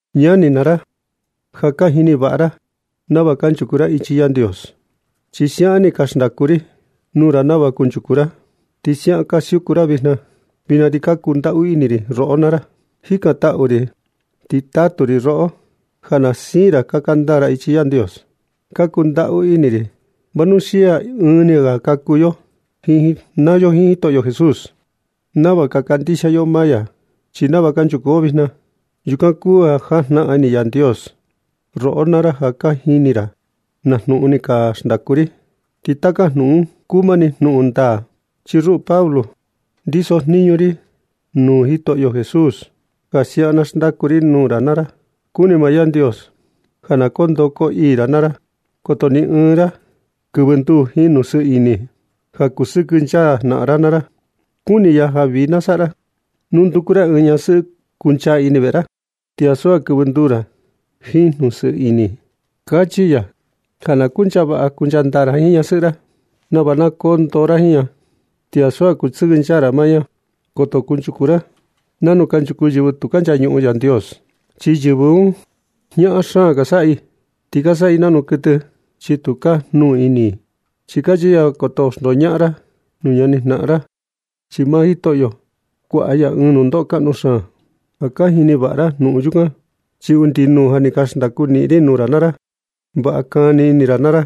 Ñani naa ra, ja ka jini vaꞌa ra nava kunchuku ra ichi Yandios, chi siaꞌan ni ka xndaku ri nuu ra nava kunchuku ra, ti siaꞌan ka siuku ra vijna. Vijna ti ka kundaꞌu ini roꞌo naa ra, jikantaꞌu ri ti tatu ri roꞌo ja na siin ra kaka ndaa ra ichi Yandios. Ka kundaꞌu ini ri vanuxia ɨɨn ni ga ni ka kuu yo naa yo jiin Jitoꞌo Jesús nava ka kandixia yo maa ya. Chi nava kanchuku yo vijna, yukan kuu ja jajnaꞌan ini Yandios. Roꞌo naa ra ja ka jini ra naa jnuꞌun ni ka xndaku ri. Ti taka jnuꞌun un kuu mani jnuꞌun ndaa, chi ruꞌu Pablo, ndisojniñu ri nuu Jitoꞌo Jesús ja siaꞌan na xndaku ri nuu ra naa ra. Kuni maa Yandios ja na koo ndoo koo ii ra naa ra. Ti koto ni ɨɨn ra kɨvɨ nduu jiin jnuꞌun sɨɨ ini ja kusɨkɨnchaa jnaꞌan ra naa ra. Kuni ya ja vii na saꞌa ra nu na nduku ra ɨɨn ñasɨꞌɨ kuncha ini veꞌe ra, ti ansu ja kɨvɨ nduu ra jiin jnuꞌun sɨɨ ini. Kachi ya ja na kuncha vaꞌa kuncha ndaa ra jiin ñasɨꞌɨ ra nava na koo ndoo ra jiin ña, ti ansu ja kusɨkɨnchaa ra maa ña. Koto kunchuku ra nanu kanchuku yɨvɨ tu ka nchañuꞌun Yandios, chi yɨvɨ un, jñaꞌan ka saꞌa i, ti ka saꞌa i nanu kuɨtɨ, chi tu ka jnuu ini i. Ti kachi ya ja koto xndoñaꞌan ra nuu ñani jnaꞌan ra, chi maa Jitoꞌo, kuaꞌa ya ɨɨn nundoꞌo kaꞌnu xaan. Ja ka jini vaꞌa ra jnuꞌun yukan, chi undi nuu ja ni ka xndaku niꞌin ri nuu ra naa ra. Vaꞌa kani ini ra naa ra,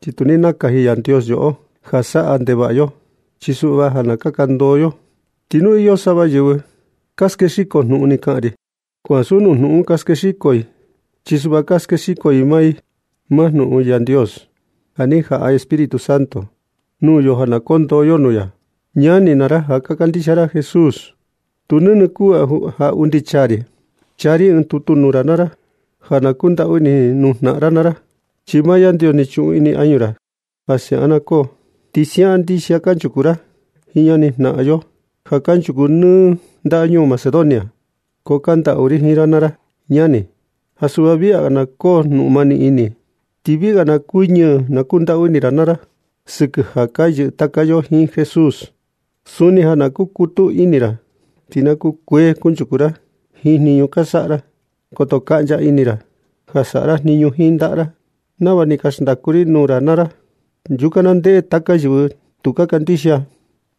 chi tu ni nakaji Yandios yoꞌo ja saꞌa ndevaꞌa yo, chi suꞌva ja na kaka ndoo yo. Ti nu ka iyo sava yɨvɨ ka skexiko jnuꞌun ni xnaꞌan ri, ko ansu nuu jnuꞌun un ka skexiko i, chi suꞌva ka skexiko i maa jnuꞌun Yandios, ya ni jaꞌa Espíritu Santo nuu yo ja na koo ndoo yo nuu ya. Ñani naa ra ja ka kandixia Jesús, tu nɨnɨ kuu ja undi chaa ri ɨɨn tutu nuu ra ja na kundaꞌu ini nuu jnaꞌan ra naa ra, chi maa Yandios ni chuꞌun ini añu ra ja siaꞌan na koo. Ti siaꞌan ndixia kanchuku ra jiin ñani jnaꞌan yo ja kanchuku nɨ ndañuu Macedonia. Ko ka kandaꞌu ri jiin ra naa ra ñani, ja suꞌva viꞌi ga na koo jnuꞌun mani ini, ti viꞌi ga na kuñɨɨ jnundaꞌu ini jiin ra naa ra, sɨkɨ ja ka yɨꞌɨ taka yo jiin Jesús. Suni ja na kukutu ini ra, ti na kukuee kunchuku ra jiin jniñu ka saꞌa ra. Koto kaꞌncha ini ra ja saꞌa ra jniñu jiin ndaꞌa ra nava ni ka xndaku ri nuu ra naa ra. Yukan na ndeꞌe taka yɨvɨ tu ka kandixia un,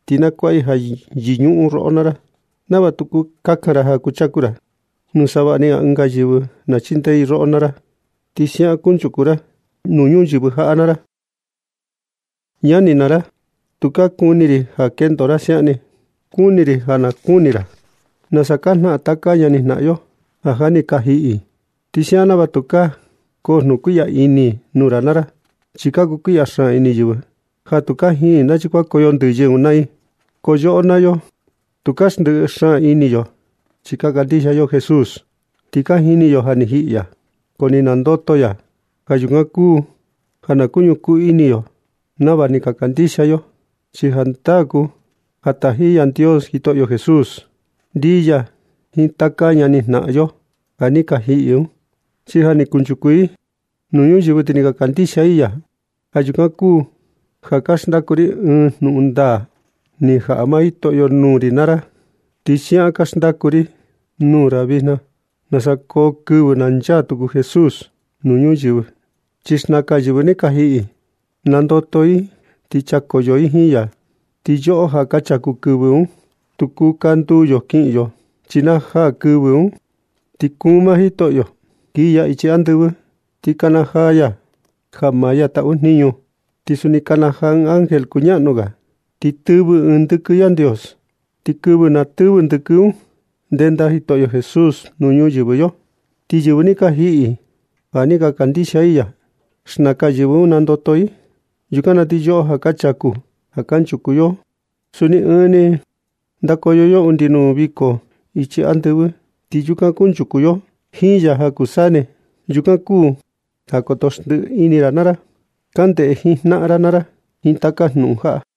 ti na kuaꞌa i ja yɨñuꞌun roꞌo naa ra, nava tu kakan ra ja kuchaku ra nuu savaꞌni ga ɨnga yɨvɨ ja na chindee i roꞌo naa ra. Ti siaꞌan kunchuku ra nuu ñuyɨvɨ jaꞌa naa ra. Ñani naa ra, tukaa kuni ri ja kendo ra siaꞌan ni, chi kuni ri ja na kuni ra nasa ka jnaꞌan taka ñani jnaꞌan yo ja ja ni ka jiꞌi. Ti siaꞌan nava tukaa koo jnuꞌun kuiꞌya ini nuu ra naa ra. Chi ka kukuiꞌya xaan ini yɨvɨ ja tu ka jini i nachi kuankoyo ndɨyɨ un naa i. Ko yoꞌo naa yo, tu ka ndɨꞌɨ xaan ini yo, chi ka kandixia yo Jesús. Ti ka jini yo ja ni jiꞌi ya, ko ni nandoto ya. Ja yukan kuu ja ka ñukuu ini yo nava ni ka kandixia yo, chi jandaa kuu ja taji Yandios Jitoꞌo Jesús ndii ya jiin taka ñani jnaꞌan yo ja ni ka jiꞌi un, chi ja ni kunchuku i nuu ñuyɨvɨ ti ni ka kandixia i ya. Ja yukan kuu ja ka xndaku ri ɨɨn jnuꞌun ndaa ni jaꞌa maa Jitoꞌo nuu ri nuu ra naa ra. Ti siaꞌan ka xndaku ri nuu ra vijna nasa koo kɨvɨ na nchaa tuku Jesús nuu ñuyɨvɨ. Chi xnakan yɨvɨ ni ka jiꞌi un nandoto i ti nchakoyo i jiin ya. Ti yoꞌo ja ka chaku kɨvɨ un, tu kuu kandu yo kiꞌin yo. Chi na jaa kɨvɨ un, ti kuun maa Jitoꞌo kii ya ichi andɨvɨ, ti kanajaa ya ja maa ya taꞌu jniñu, ti suni kanajaa ɨɨn ángel kuñaꞌnu ga, ti tɨvɨ ɨɨn ndɨkɨ Yandios. Ti kɨvɨ na tɨvɨ ndɨkɨ un, ndenda Jitoꞌo Jesús nuu ñuyɨvɨ yo. Ti yɨvɨ ni ka jiꞌi, ja ni ka kandixia i ya, xnakan yɨvɨ un, nandoto i. Yukan na ti yoꞌo ja ka chaku ja kanchuku yo, suni ɨɨn ni, ndakoyo undi nuu viko ichi andɨvɨ un, ti yukan kunchuku yo saa ni jiin ya ja kuu saa ni. Yukan kuu ja koto xndiꞌi ra ini ra naa ra. Kaꞌan ndee jiin jnaꞌan ra naa ra jiin taka jnuꞌun jaꞌa.